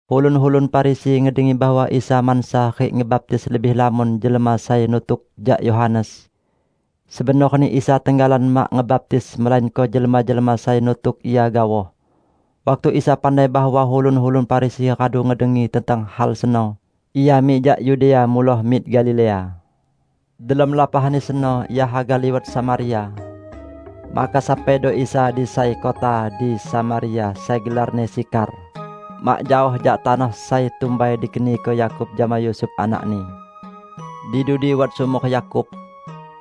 Ulun-ulun Farisi ngedengi bahwa Isa mansa rik ngebaptis lebih lamon jelma sai nutuk jak Yohanes. ( Sebenorni Isa tenggalan mak ngebaptis melainko jelma-jelma sai nutuk Ia gaoh.) Waktu Isa pandai bahwa ulun-ulun Farisi radu ngedengi tentang hal seno, Ia mik jak Yudea muloh mik Galilea. Delom lapahni seno Ia haga liwat Samaria. Maka sampaido Isa di sai kota di Samaria sai gelarni Sikhar, mak jaoh jak tanoh sai tumbai dikeniko Yakub jama Yusuf anakni. Di dudi wat sumor Yakub.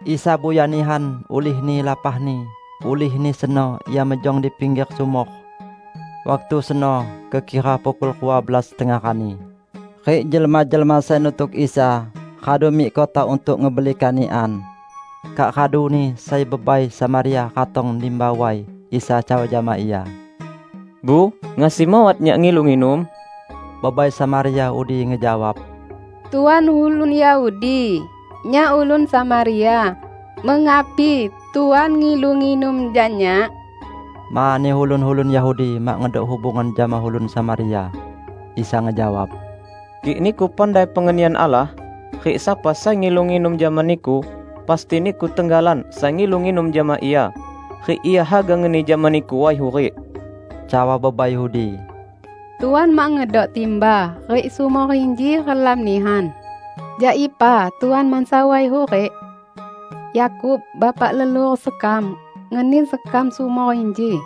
Isa buya nihan ulihni lapahni, ulihni seno Ia mejong di pingger sumor. Waktu seno kekira pukul rua belas tengah rani, rik jelma-jelma sai nutuk Isa radu mik kota untuk ngebeli kanikan. Kak raduni sai bebai Samaria ratong nimba way. Isa cawa jama ia, "Bu, ngasi mawat Nyak ngilu nginum?" Bebai Samaria udi ngejawab, "Tuan ulun Yahudi, nyak ulun Samaria; mengapi Tuan ngilu nginum jak nyak?" (Mani ulun-ulun Yahudi mak ngedok hubungan jama ulun Samaria.) Isa ngejawab, "Kik niku pandai pengenian Allah rik sapa sai ngilu nginum jama niku, pasti niku tenggalan sai ngilu nginum jama Ia, rik Ia haga ngeni jama niku way hurik." Cawa bebai udi, "Tuan mak ngedok timba, rik sumor inji relam nihan. Jak ipa Tuan mansa way hurik? Yakub, bapak leluhur sekam, ngeni sekam sumor inji.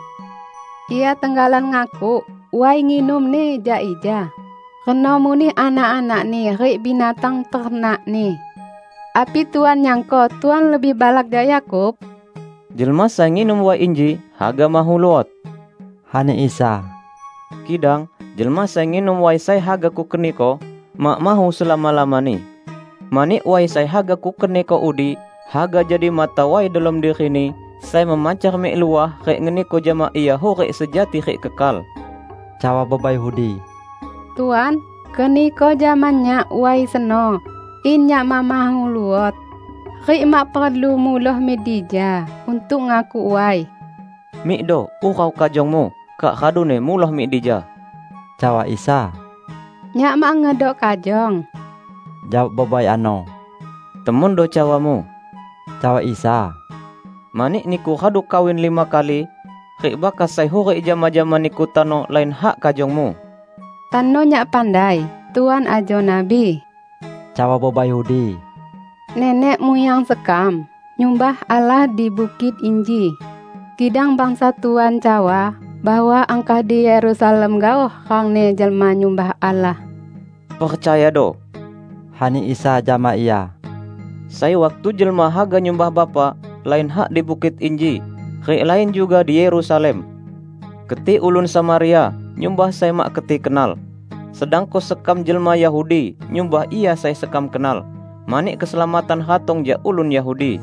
Ia tenggalan ngakuk way nginumni jak ija; reno muneh anak-anakni rik binatang ternakni. Api Tuan nyangko Tuan lebih balak jak Yakub?" "Jelma sai nginum way inji haga mahu luot," ani Isa, "kidang jelma sai nginum way sai haga Kukeniko, mak mahu selama-lamani. Mani way sai haga Kukeniko udi haga jadi mata way delom dirini sai memancar mik luah rik ngeniko jama ia hurik sejati rik kekal." Cawa bebai udi, "Tuan, keniko jama nyak way seno, in nyak mak mahu luot; rik mak perlu muloh mik dija untuk ngakuk way." "Mikdo, urau kajongmu, kak raduni muloh mik dija," cawa Isa. "Nyak mak ngedok kajong," jawab bebai ano. "Temondo cawamu," cawa Isa. "Mani niku radu kawin lima kali, rik bakas sai hurik jama-jama niku tano lain hak kajongmu." "Tano nyak pandai Tuan ajo nabi," cawa bebai udi. "Nenek muyang sekam nyumbah Allah di bukit inji, kidang bangsa Tuan cawa bahwa angkah di Yerusalem gaoh rangni jelma nyumbah Allah." "Percayado," ani Isa jama ia, "sai waktu jelma haga nyumbah Bapa, lain hak di bukit inji, rik lain juga di Yerusalem. Keti ulun Samaria nyumbah sai mak keti kenal, sedangko sekam jelma Yahudi nyumbah Ia sai sekam kenal, mani keselamatan ratong jak ulun Yahudi.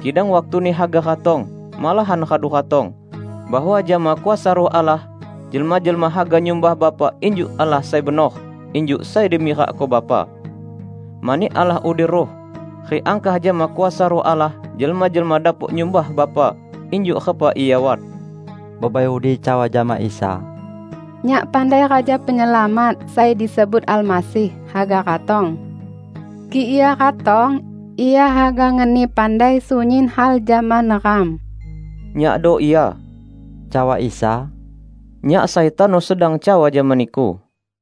Kidang waktuni haga ratong, malahan radu ratong, bahwa jama kuasa Ruh Allah jelma-jelma haga nyumbah Bapa injuk Allah sai benor injuk sai dimirakko Bapa. Mani Allah udi Ruh, rik angkah jama kuasa Ruh Allah jelma-jelma dapok nyumbah Bapa injuk repa Ia wat." Bebai udi cawa jama Isa, "Nyak pandai Raja Penyelamat (sai disebut Almasih) haga ratong. Kik Ia ratong, Ia haga ngeni pandai sunyin hal jama neram." "Nyakdo Ia," cawa Isa, "Nyak sai tano sedang cawa jama niku."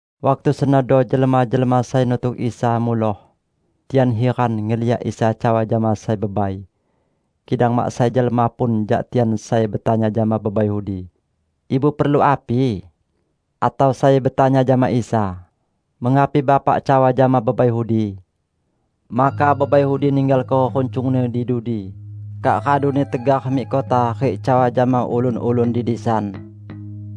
Waktu senodo jelma-jelma sai nutuk Isa muloh. Tian hiran ngeliak Isa cawa jama sai bebai. Kidang mak sai jelma pun jak tian sai betanya jama bebai udi, "Ibu perlu api?" atau sai betanya jama Isa, "Mengapi Bapak cawa jama bebai udi?" Maka bebai udi ninggalko runcungni di dudi kak raduni tegar mik kota rik cawa jama ulun-ulun di disan,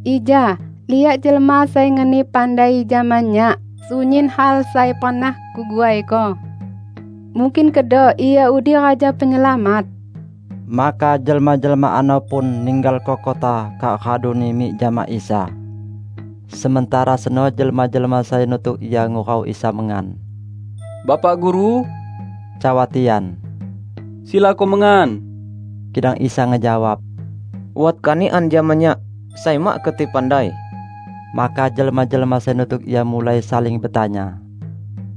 "Ija liak jelma sai ngeni pandai jama nyak sunyin hal sai pernah kuguaiko. Mungkin kedo Ia udi Raja Penyelamat?" Maka jelma-jelma ano pun ninggalko kota kak raduni mik jama Isa. Sementara seno jelma-jelma sai nutuk Ia ngurau Isa mengan. "Bapak Guru," cawa tian, "silako mengan." Kidang Isa ngejawab, "Wat kanikan jama Nyak, sai mak keti pandai." Maka jelma-jelma sai nutuk Ia mulai saling betanya,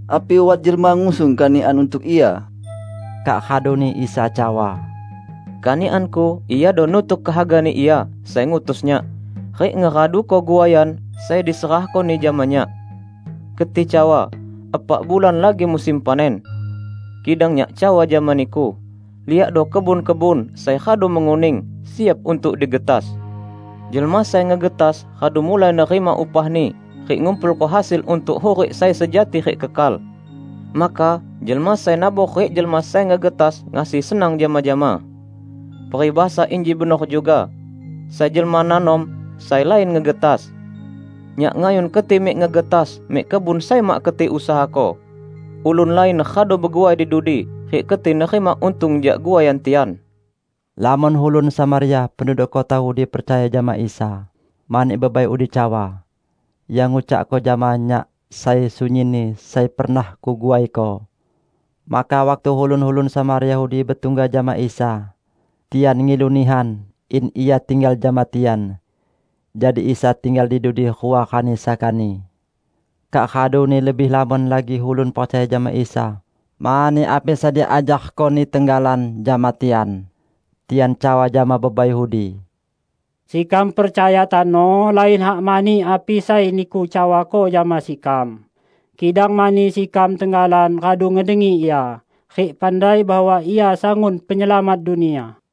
"Api wat jelma ngusung kanikan untuk Ia?" Kak raduni Isa cawa, "Kanikan-Ku iado nutuk kehaga-Ni Ia sai ngutus Nyak, rik ngeraduko guaian sai diserahko-Ni jama Nyak. Keti cawa, 'Epak bulan lagi musim panen.' Kidang Nyak cawa jama niku: Liakdo kebun-kebun sai radu menguning, siap untuk digetas! Jelma sai ngegetas radu mulai nerima upahni rik ngumpulko hasil untuk hurik sai sejati rik kekal. Maka jelma sai nabor rik jelma sai ngegetas ngasi senang jama-jama. Peribahasa inji benor juga, 'Sai jelma nanom, sai lain ngegetas!' Nyak ngayun keti mik ngegetas mik kebun sai mak keti usahako; ulun lain radu beguai di dudi, rik keti nerima untung jak guaian tian." Lamon ulun Samaria penduduk kota udi percaya jama Isa, mani bebai udi cawa, "Ia ngucakko jama nyak sai sunyinni sai pernah kuguaiko." Maka waktu ulun-ulun Samaria udi betungga jama Isa, tian ngilu nihan in Ia tinggal jama tian. Jadi Isa tinggal di dudi rua rani sakani. Kak raduni lebih lamon lagi ulun percaya jama Isa mani api sai diajarko-Ni tenggalan jama tian. Tian cawa jama bebai udi, "Sekam percaya tano, lain hak mani api sai niku cawako jama sekam, kidang mani sekam tenggalan radu ngedengi Ia, rik pandai bahwa Ia sangun Penyelamat dunia."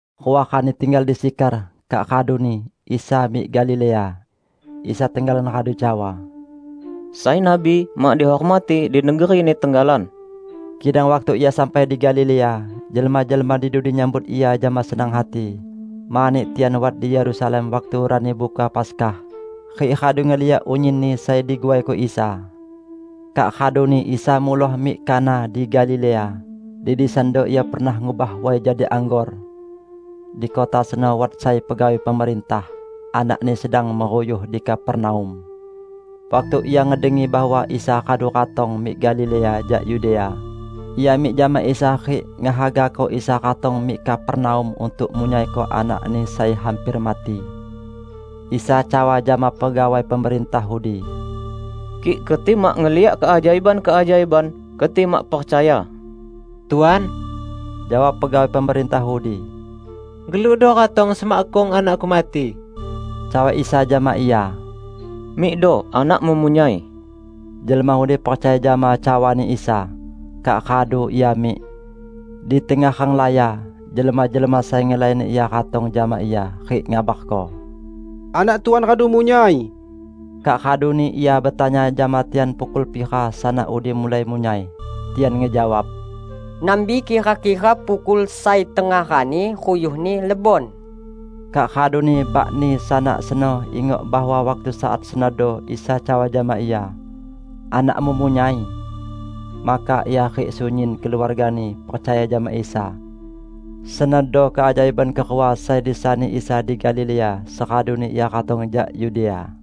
Rua rani tinggal di Sikhar kak raduni, Isa mik Galilea. Isa tenggalan radu cawa, "Sai nabi mak dihormati di negerini tenggalan." Kidang waktu Ia sampai di Galilea, jelma-jelma di dudi nyambut Ia jama senang hati, mani tian wat di Yerusalem waktu Rani Buka Paskah, rik radu ngeliak unyinni sai diguaiko Isa. Kak raduni Isa muloh mik Kana di Galilea, di disando Ia pernah ngubah way jadi anggor. Di kota seno wat sai pegawai pemerintah, anakni sedang meruyuh di Kapernaum. Waktu ia ngedengi bahwa Isa radu ratong mik Galilea jak Yudea, ia mik jama Isa rik ngehagako Isa ratong mik Kapernaum untuk munyaiko anakni sai hamper mati. Isa cawa jama pegawai pemerintah udi, "Kik keti mak ngeliak keajaiban-keajaiban, keti mak percaya." "Tuan," jawab pegawai pemerintah udi, "gelukdo ratong semakkung anakku mati." Cawa Isa jama ia, "Mikdo anakmu munyai." Jelma udi percaya jama cawani Isa, kak radu ia mik. Di tengah renglaya, jelma-jelma sai ngelayani ia ratong jama ia rik ngabarko, "Anak Tuan radu munyai." Kak raduni ia betanya jama tian pukul pira sanak udi mulai munyai. Tian ngejawab, "Nambi kira-kira pukul sai tengah rani ruyuhni lebon." Kak raduni bakni sanak seno ingok bahwa waktu saat senodo Isa cawa jama ia, "Anakmu munyai." Maka ia rik sunyin keluargani percaya jama Isa. Senodo keajaiban kerua sai disani Isa di Galilea seraduni Ia ratong jak Yudea.